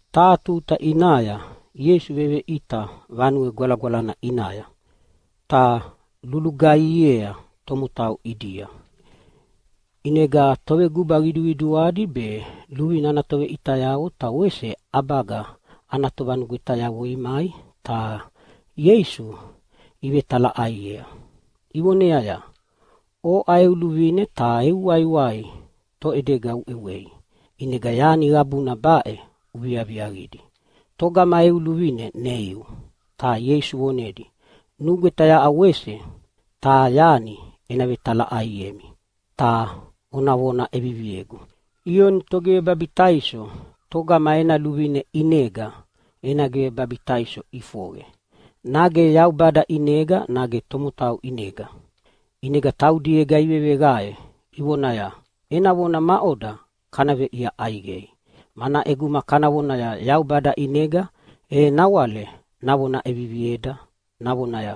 Taha tuta ʼinaya Ieisu veveʼita Vanue Gwalagwalana ʼinaya ta lulugaihiea tomotau ʼidia. ʼInega toveguba qiduqiduadi be luvine ana toveʼitayavo ta wese ʼabaga ana tovanugwetayavo imai ta Ieisu ivevetalaʼaiea, ivoneaya, “Oʼa eu luvine ta eu waiwai toʼedega uʼewei ʼinega yani qabuna baʼe uviaviaqidi? Togama eu luvine neiu?” Ta Ieisu vonedia, “Nugweta yaʼa wese taha yani ena vetalaʼaiemi ta ona vona ʼeviviegu. Ioni Togivebabitaiso togama ena luvine ʼinega ena givebabitaiso ʼifoqe, nage Yaubada ʼinega nage tomotau ʼinega?” ʼInega taudiega iveveqae ivonaya, “Ena vona maʼoda kana veʼia ʼaiqei? Mana ʼeguma kana vonaya, ‘Yaubada ʼinega’, e nawale navona ʼevivieda navonaya,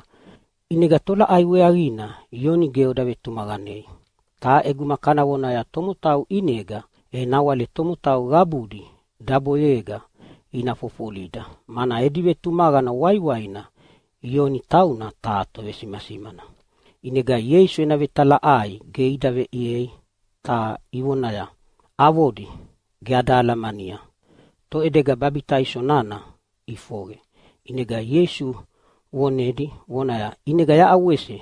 ‘ʼInega tolaʼai weaqina Ioni ge oda vetumaqanei?’ Ta ʼeguma kana vonaya, ‘Tomotau ʼinega’, e nawale tomotau qabudi daboyega ina fofolida, mana edi vetumaqana waiwaina Ioni tauna taha tovesimasimana.” ʼInega Ieisu ena vetalaʼai ge ida veʼiei, ta ivoneaya, “Avodi, ge ada alamania toʼedega babitaiso nana ʼifoqe.” ʼInega Ieisu vonedi vonaya, “ʼInega yaʼa wese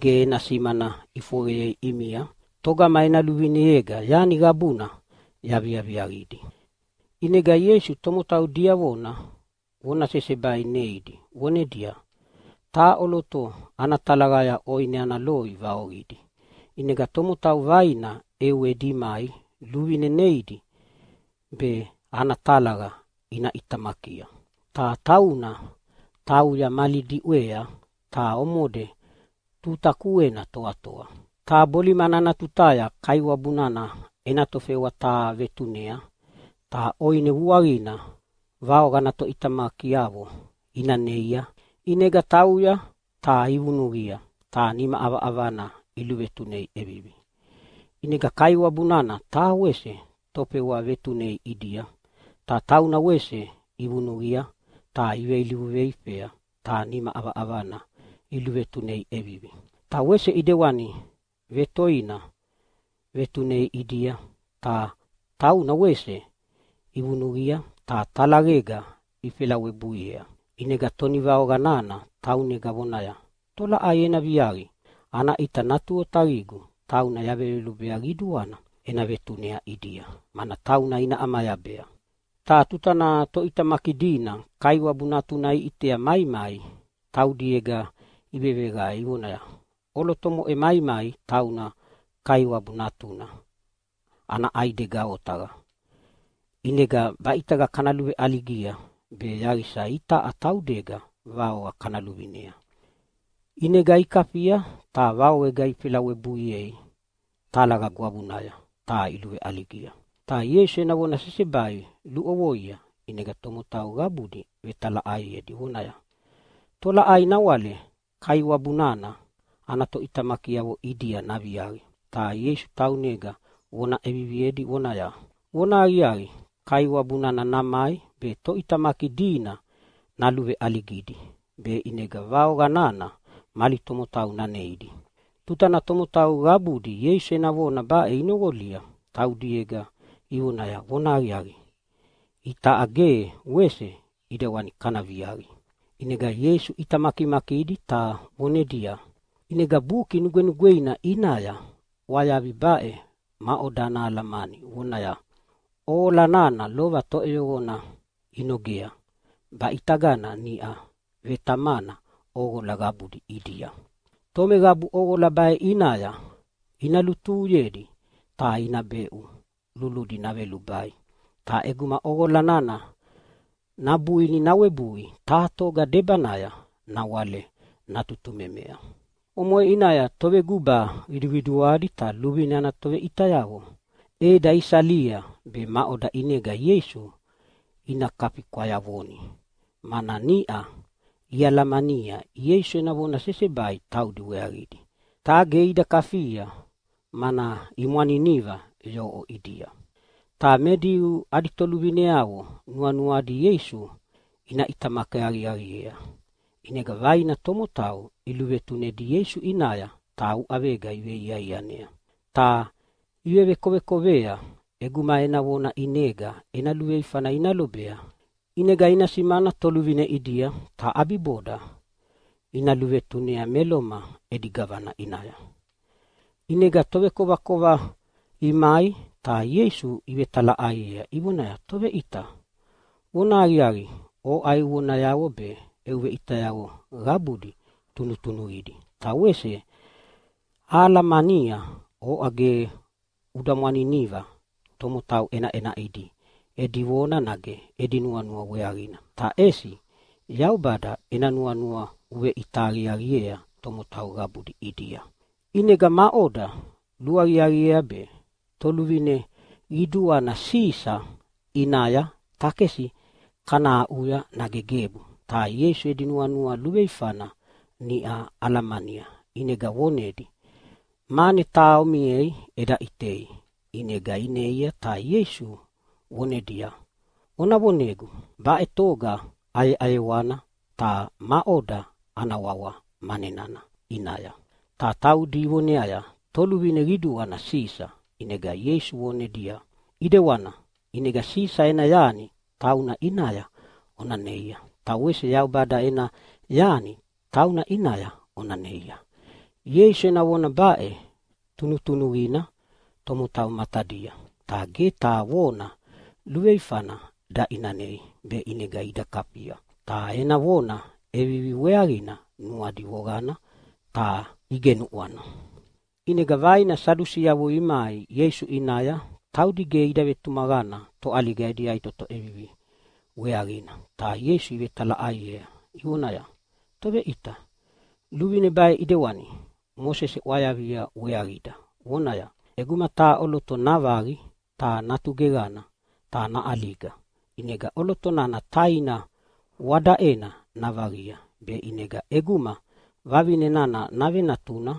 ge ena simana ʼifoqeyei ʼimia togama ena luvineyega yani qabuna yaviaviaqidi.” ʼInega Ieisu tomotau diavona vona sesebai neidi vonedia, “Taha ʼoloto ana talaqaya ʼoine ana loi vaoqidi, ʼinega tomotau vaina ʼewedi imai luvine neidi be ana talaqa ina ʼitamakia. Ta tauna tauya mali diʼwea ta omode tuta kuena toatoa. Ta bolimana ana tutaya kaiwabu nana ena tofewa taha vetunea ta ʼoine vuaqina vaoqa ana toʼitamakiavo ina neia. ʼInega tauya ta ivunuqia ta nima ʼavaʼavana iluvetunei ʼevivi. ʼInega kaiwabu nana taha wese tofewa vetunei ʼidia. Ta tauna wese ivunuqia ta iveilivu veifea ta nima ʼavaʼavana iluvetunei ʼevivi. Ta wese ʼidewani vetoina vetunei ʼidia ta tauna wese ivunuqia ta talaqega ifelawebuiea. “ʼInega tonivaoqa nana taunega vonaya, ‘Tolaʼai ena viaqi? Ana ʼita natu otaqigu tauna yaveyolubea qiduana ena vetunei ʼidia, mana tauna ina ʼamayabea.’ “Ta tutana toʼitamaki dina kaiwabu natuna iʼitea maimai taudiega iveveqae ivonaya, ‘ʼOloto omoʼe maimai tauna kaiwabu natuna ana ʼaidega otaqa. ʼInega baʼitagana kana luveʼaligia be yaqisa itaʼa taudega vaoqa kana luvinea.’ ʼInega ikafia ta vaoqega ifelei webui talaqa gwavunaya ta iluveʼaligia.” Ta Ieisu ena vona sesebai luʼovoia ʼinega tomotau qabudi vetalaʼaiedi vonaya, “Tolaʼai nawale kaiwabu nana ana toʼitamakiavo ʼidia naviaqi?” Ta Ieisu taunega vona ʼeviviedi vonaya, “Vonahaqiaqi, kaiwabu nana namai be toʼitamaki dina naluveʼaligidi be ʼinega vaoqa nana mali tomotau naneidi.” Tutana tomotau qabudi Ieisu ena vona baʼe inoqolia taudiega ivonaya, “Vonahaqiaqi, itaʼa ge wese ʼidewani kana viaqi!” ʼInega Ieisu ʼita makimakidi ta vonedia, “ʼInega Buki Nugwenugweina ʼinaya ʼwayavi baʼe maʼoda ana alamani, vonaya? ‘ʼOqola nana lova toʼeyoqona inogea, baʼitagana niʼau vetamana ʼoqola qabudi ʼidia.’ Tomeqabu ʼoqola baʼe ʼinaya ina lutuhuyedi ta ina beʼu luludi naʼevelubai, ta ʼeguma ʼoqola nana nabuini nawebui taha toga debanaya nawale natutumemea.” Omoʼe ʼinaya toveguba qiduqiduadi ta luvine ana toveʼitayavo ʼeda isalia be maʼoda ʼinega Ieisu ina kafi kwayavoni, mana niʼa ialamania Ieisu ena vona sesebai taudi weaqidi. Ta ge ida kafia, mana imwaniniva yoʼo ʼidia. Ta me Diu adi toluvineavo nuanuadi Ieisu ina ʼitamaki aqiaqiea. ʼInega vaina tomotau iluvetunedi Ieisu ʼinaya ta uʼavega iveiaianea, ta ivevekovekovea ʼeguma ena vona ʼinega ena luveifana ina lobea. ʼInega ina simana toluvine ʼidia, ta ʼabiboda ina luvetunea me Loma edi gavana ʼinaya. ʼInega tovekovakova imai ta Ieisu ivetalaʼaiea ivonaya, “Toveʼita, vonahaqiaqi oʼa eu vonayavo be eu veʼitayavo qabudi tunutunuqidi, ta wese ahalamania oʼa ge uda mwaniniva tomotau ʼenaʼenaʼidi edi vona nage edi nuanua weaqina, ta ʼesi Yaubada ena nuanua uveʼita aqiaqiea tomotau qabudi ʼidia. ʼInega maʼoda luaqiaqiea be toluvine qiduana Sisa ʼinaya takesi kana aʼuya nage gebu?” Ta Ieisu edi nuanua luveifana niʼa alamania ʼinega vonedia, “Mane taha omiei eda ʼitei.” ʼInega ineia ta Ieisu vonedia, “Ona vonegu baʼe toga ʼayeʼayewana ta maʼoda ana wawa mane nana ʼinaya?” Ta taudi ivoneaya, “Toluvine qiduana Sisa.” ʼInega Ieisu vonedia, “ʼIdewana, ʼinega Sisa ena yani tauna ʼinaya ona neia, ta wese Yaubada ena yani tauna ʼinaya ona neia.” Ieisu ena vona baʼe tunutunuqina tomotau matadia, ta ge taha vona luveifana daʼinanei be ʼinega ida kafia. Ta ena vona ʼevivi weaqina nuadi voqana ta igenuʼwana. ʼInega vaina Sadusiavo imai Ieisu ʼinaya, taudi ge ida vetumaqana toʼaliga edi yaʼitoto ʼevivi weaqina, ta Ieisu ivetalaʼaiea ivonaya, “Toveʼita, luvine baʼe ʼidewani Mosese ʼwayavia weaqida vonaya, ‘ʼEguma taha ʼoloto navaqi ta natu geqana ta naʼaliga, ʼinega ʼoloto nana taina wadaʼena navaqia be ʼinega ʼeguma vavine nana navenatuna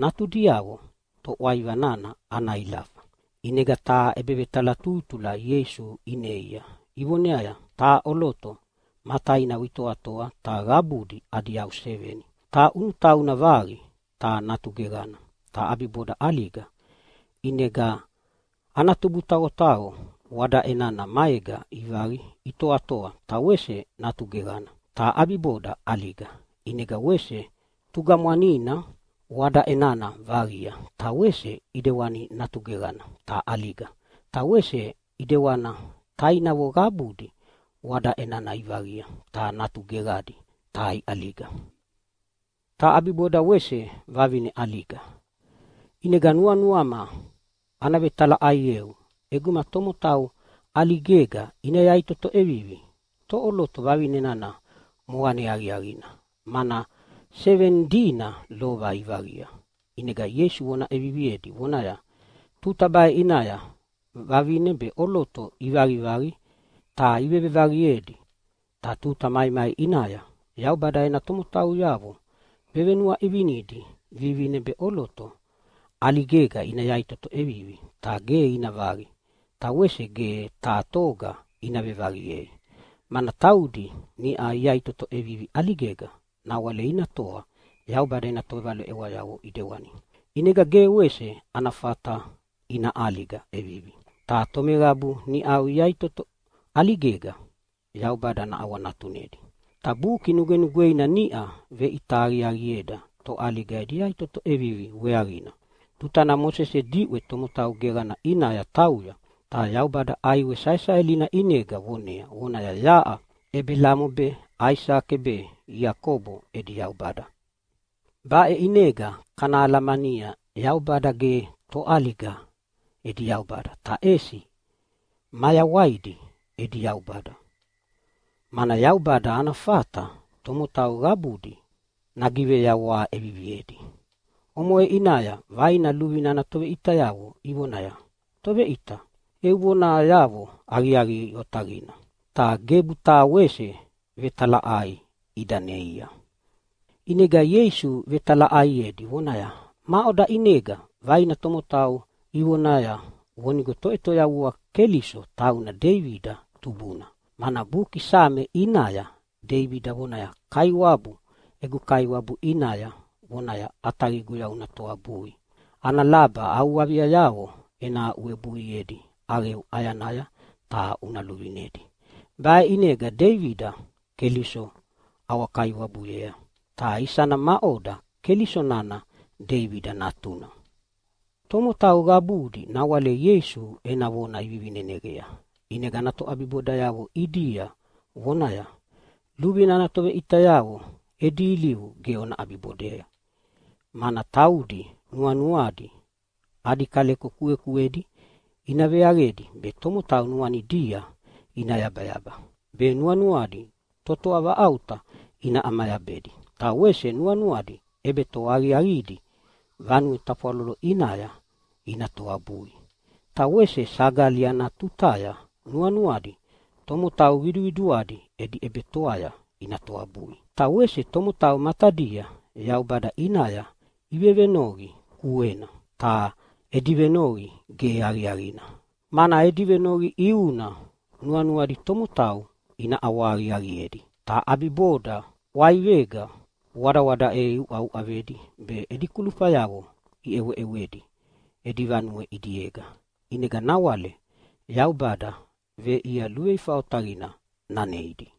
natudiavo toʼwaiva nana ana ilafa.’” ʼInega taha ʼebevetalatutula Ieisu ineia ivoneaya, “Taha ʼoloto ma tainavo itoatoa, ta qabudi adi yau seveni. Ta ʼunutauna vaqi ta natu geqana ta ʼabiboda ʼaliga. ʼInega ana tubutaqotaqo wadaʼe nana maega ivaqi itoatoa ta wese natu geqana ta ʼabiboda ʼaliga. ʼInega wese tugamwanina wadaʼe nana vaqia ta wese ʼidewani natu geqana ta ʼaliga. Ta wese ʼidewana tainavo qabudi wadaʼe nana ivaqia, ta natu geqadi ta iʼaliga. Ta ʼabiboda wese vavine ʼaliga. ʼInega nuanuama ana vetalaʼaieu, ʼeguma tomotau ʼaligega ina yaʼitoto ʼevivi e toʼoloto vavine nana moqane aqiaqina, mana seveni dina lova ivaqia?” ʼInega Ieisu vona ʼeviviedi vonaya, “Tuta baʼe ʼinaya vavine be ʼoloto ivaqivaqi ta ivevevaqiedi. Ta tuta maimai ʼinaya Yaubada ena tomotauyavo venuaʼivinidi vivine be ʼoloto ʼaligega ina yaʼitoto ʼevivi, ta ge ina vaqi ta wese ge taha toga ina vevaqiei. Mana taudi niʼau iyaʼitoto ʼevivi ʼaligega nawale ina toa Yaubada ena tovaleʼewayavo ʼidewani, ʼinega ge wese ana fata ina ʼaliga ʼevivi. Ta tomeqabu niʼau iyaʼitoto ʼaligega Yaubada naʼawanatunedi. “Ta Buki Nugwenugweina niʼa veʼita aqiaqieda toʼaliga edi yaʼitoto ʼevivi weaqina tutana Mosese diʼwe tomotau geqana ʼinaya tauya ta Yaubada ʼaiwe saesaelina ʼinega vonea vonaya, ‘Yaʼa Ebelamo be Aisake be Iakobo edi Yaubada.’ Baʼe ʼinega kana alamania Yaubada ge toʼaliga edi Yaubada, ta ʼesi mayawaidi edi Yaubada, mana Yaubada ana fata tomotau qabudi nagiveyawaha ʼeviviedi.” Omoʼe ʼinaya vaina luvine ana toveʼitayavo ivonaya, “Toveʼita, eu vonayavo aqiaqi otaqina!” Ta gebu taha wese vetalaʼai ida neia. ʼInega Ieisu vetalaʼaiedi vonaya, “Maʼoda ʼinega vaina tomotau ivonaya vonigo Toʼetoyavua Keliso tauna Deibida tubuna? Mana buki Same ʼinaya Deibida vonaya, ‘Kaiwabu egu Kaiwabu ʼinaya vonaya, “ʼAtaqiguya una toabui ana laba au aviayavo ena aʼuwebuiedi ʼaqeu ʼayanaya ta una luvinedi.” ’ Baʼe ʼinega Deibida Keliso ʼawa-Kaiwabuyea, ta isana maʼoda Keliso nana Deibida natuna?” Tomotau qabudi nawale Ieisu ena vona ivivineneqea, ʼinega ana toʼabibodayavo ʼidia vonaya, “Luvine ana toveʼitayavo edi ilivu ge ona ʼabibodei, mana taudi nuanuadi adi kaleko kuekuedi ina veaqedi be tomotau nuanidia ina yabayaba be nuanuadi totoa vaʼauta ina ʼamayabedi. Ta wese nuanuadi ʼebetoa aqiaqidi vanue tafwalolo ʼinaya ina toabui, ta wese sagali ana tutaya nuanuadi tomotau qiduqiduadi edi ʼebetoaya ina toabui. Ta wese tomotau matadia Yaubada ʼinaya ivevenoqi kuena, ta edi venoqi ge aqiaqina, mana edi venoqi ʼiuna nuanuadi tomotau ina ʼawahaqiaqiedi. Ta ʼabiboda ʼwaivega wadawadaʼe iuʼauʼavedi be edi kulufayavo iʼeweʼewedi edi vanue ʼidiega. ʼInega nawale Yaubada veʼia luveifa otaqina naneidi.”